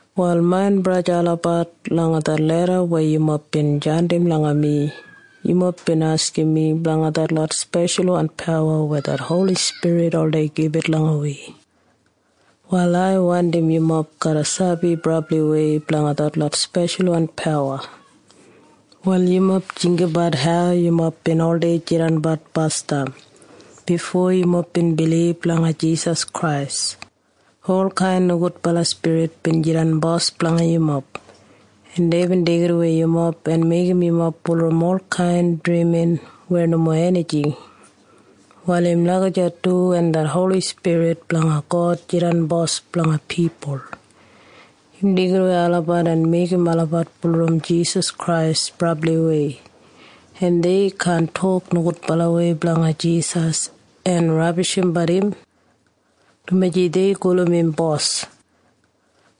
Wal main braja en sista olabat, langa det leda weya yumob bin jandim langa mi, yumob bin askim mi blanga detlot speshalwan pawa weya det Holi Spirit oldei gibit langa wi. Wal ai wandim yumob garra sabi brabliwei blanga detlot speshalwan pawa. Wal yumob jinggabat hau yumob bin oldei jidanbat basdam bifo yumob bin bilib langa Jisas Krais. Olkain nogudbala spirit bin jidan bos blanga yumob, en deibin deigidawei yumob en meigim yumob bulurrum olkain drimin weya nomo enijing. Wal im lagijat du wen det Holi Spirit blanga God jidan Bos blanga pipul. Im deigidawei olabat en meigim olabat bulurrum Jisas Krais brabliwei, en dei kaan tok nogudbalawei blanga Jisas en rabishimbat im, dumaji dei gulum im Bos.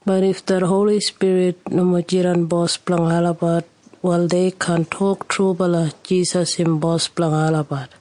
Bat if det Holi Spirit nomo jidan Bos blanga olabat, wal dei kaan tok trubala Jisas im Bos blanga olabat.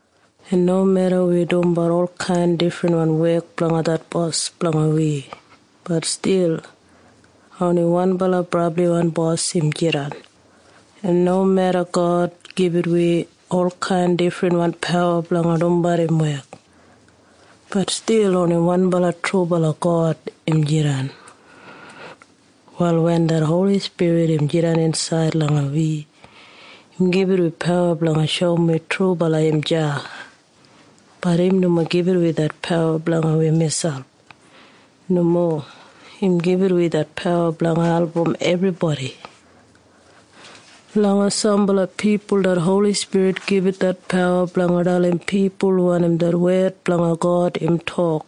En nomeda wi dumbat olkain difrinwan wek blanga det Bos blanga wi, bat stil oni wanbala Brabliwan Bos im jidan. En nomeda God gibit wi olkain difrinwan pawa blanga dumbat im wek, bat stil oni wanbala trubala God im jidan. Wal wen det Holi Spirit im jidan insaid langa wi, im gibit wi pawa blanga shoum wi trubala im deya. Bat im nomo gibit wi det pawa blanga wi miselp. Nomo. Im gibit wi det pawa blanga album ebribodi. Langa sambala pipul det Holi Spirit gibit det pawa blanga dalim pipul wanim det wed blanga God im tok.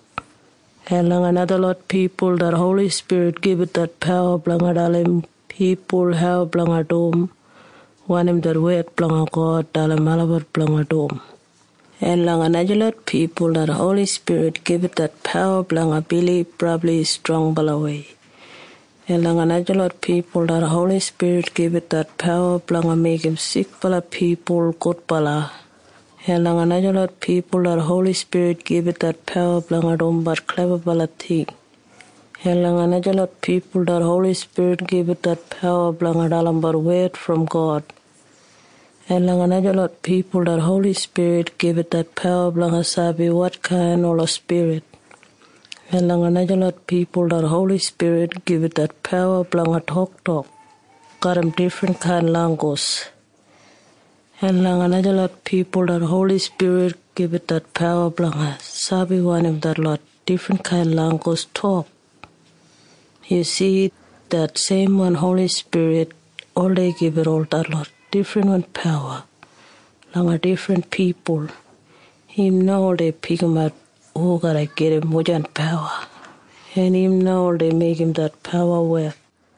En langa najalot pipul det Holi Spirit gibit det pawa blanga dalim pipul hau blanga dum wanim det wed blanga God dalim olabat blanga dum. En langa najalot pipul det Holi Spirit gibit det pawa blanga bilib brabli strongbalawei. En langa najalot pipul det Holi Spirit gibit det pawa blanga meigim sikbala pipul gudbala. En langa najalot pipul det Holi Spirit gibit det pawa blanga dumbat klebabala ting. En langa najalot pipul det Holi Spirit gibit det pawa blanga dalimbat wed brom God. En langa najalot pipul det Holi Spirit gibit det pawa blanga sabi wotkain ola spirit. En langa najalot pipul det Holi Spirit gibit det pawa blanga toktok garram difrinkain langgus. En langa najalot pipul det Holi Spirit gibit det pawa blanga sabi wanim detlot difrinkain langgus tok. Yu si? Det seimwan Holi Spirit oldei gibit ol detlot difrinwan pawa langa difrin pipul. Im na oldei pikimat hu garra gedim wujan pawa, en im na oldei meigim det pawa wek.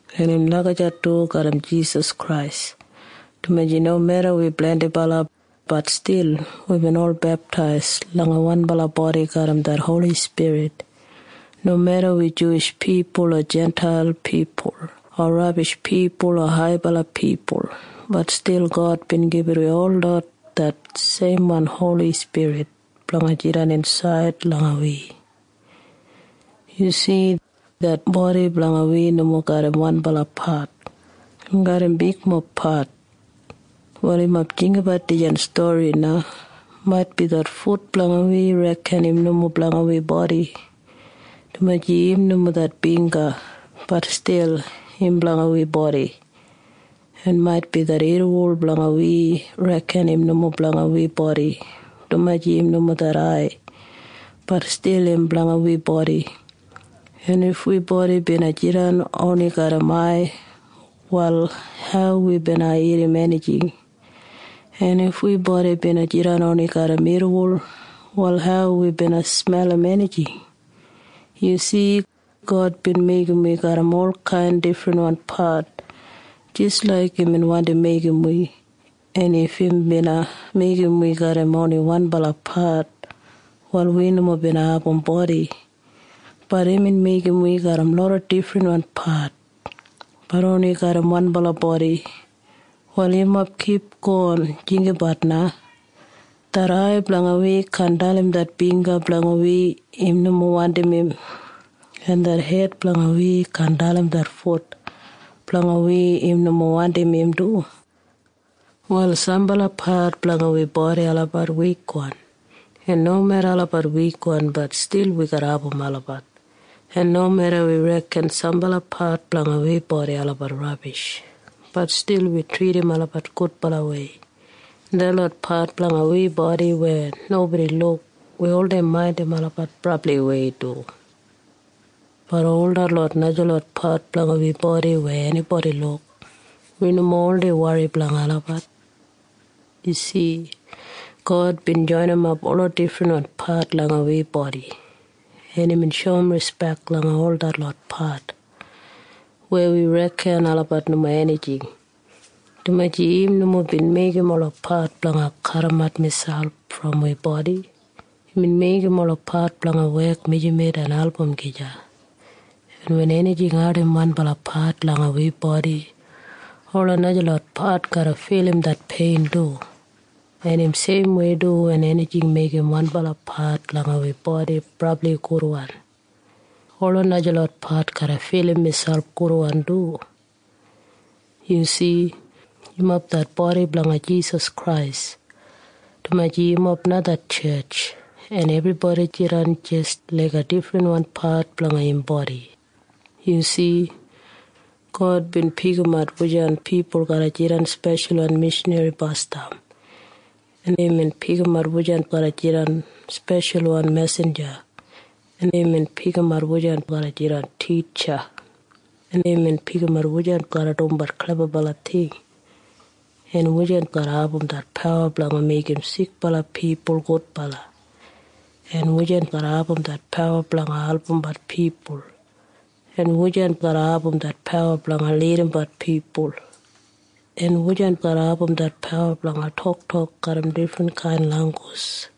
En im lagijat du garram Jisas Krais, dumaji nomeda wi blendibala, bat stil wibin ol beptais langa wanbala bodi garram det Holi Spirit. Nomeda wi Juwish pipul o Jintail pipul o rabish pipul o haibala pipul, bat stil God bin gibit wi holot det seimwan Holi Spirit blanga jidan insaid langa wi. Yu si? Det bodi blanga wi nomo garram wanbala pat. Im garram bigmob pat. Wal yumob jinggabat dijan stori na. Maitbi det fut blanga wi reken im nomo blanga wi bodi, dumaji im nomo det bingga. Bat stil im blanga wi bodi. En maitbi det irriwol blanga wi reken im nomo blanga wi bodi, dumaji im nomo det ai. Bat stil im blanga wi bodi. En if wi bodi bina jidan oni garram ai, wal hau wi bina irrim enijing? En if wi bodi bina jidan oni garram irriwol, wal hau wi bina smelim enijing? Yu si? God bin meigim wi garram olkain difrinwan pat jis laik imbin wandi meigim wi. En if im bina meigim wi garram oni wanbala pat, wal wi nomo bina abum bodi. Bat imbin meigim wi garram loda difrinwan pat, bat oni garram wanbala bodi. Wal yumob kipgon jinggabat na. Det ai blanga wi kaan dalim det bingga blanga wi im nomo wandim im. En det hed blanga wi kaan dalim det fut blanga wi im nomo wandim im du. Wal sambala pat blanga wi bodi olabat wikwan, en nomeda olabat wikwan, bat stil wi garra abum olabat. En nomeda wi reken sambala pat blanga wi bodi olabat rabish, bat stil wi tridim olabat gudbalawei. En detlot pat blanga wi bodi weya nobodi luk, wi oldei maindim olabat brabliwei du. Bat ol detlot najalot pat blanga wi bodi weya enibodi luk, wi nomo oldei wori blanga olabat. Yu si? God bin joinimap ola difrinwan pat langa wi bodi, en imbin shoum rispek langa ol detlot pat weya wi reken olabat nomo enijing, dumaji im nomo bin meigim ola pat blanga kadimat miselp brom wi bodi. Imbin meigim ola pat blanga wek mijamet en album gija. En wen enijing ardim wanbala pat langa wi bodi, ola najalot pat garra filim det pein du. En im seimwei du wen enijing meigim wanbala pat langa wi bodi brabli gudwan, ola najalot pat garra filim miselp gudwan du. Yu si? Yumob det bodi blanga Jisas Krais, dumaji yumob na det tjetj. En ebribodi jidan jis laiga difrinwan pat blanga im bodi. Yu si? God bin pikimat wujan pipul garra jidan speshalwan mishanri basdam. En imbin pikimat wujan garra jidan speshalwan mesinja, en imbin pikimat wujan garra jidan titja. En imbin pikimat wujan garra dumbat klebabala ting, en wujan garra abum det pawa blanga meigim sikbala pipul gudbala, en wujan garra abum det pawa blanga albumbat pipul, en wujan garra abum det pawa blanga lidimbat pipul, en wujan garra abum det pawa blanga toktok garram difrinkain langgus.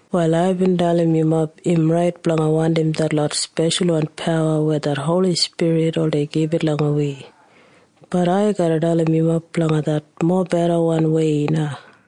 Wal aibin dalim yumob im rait blanga wandim detlot speshalwan pawa weya det Holi Spirit oldei gibit langa wi. Bat ai garra dalim yumob blanga det mobedawan wei na.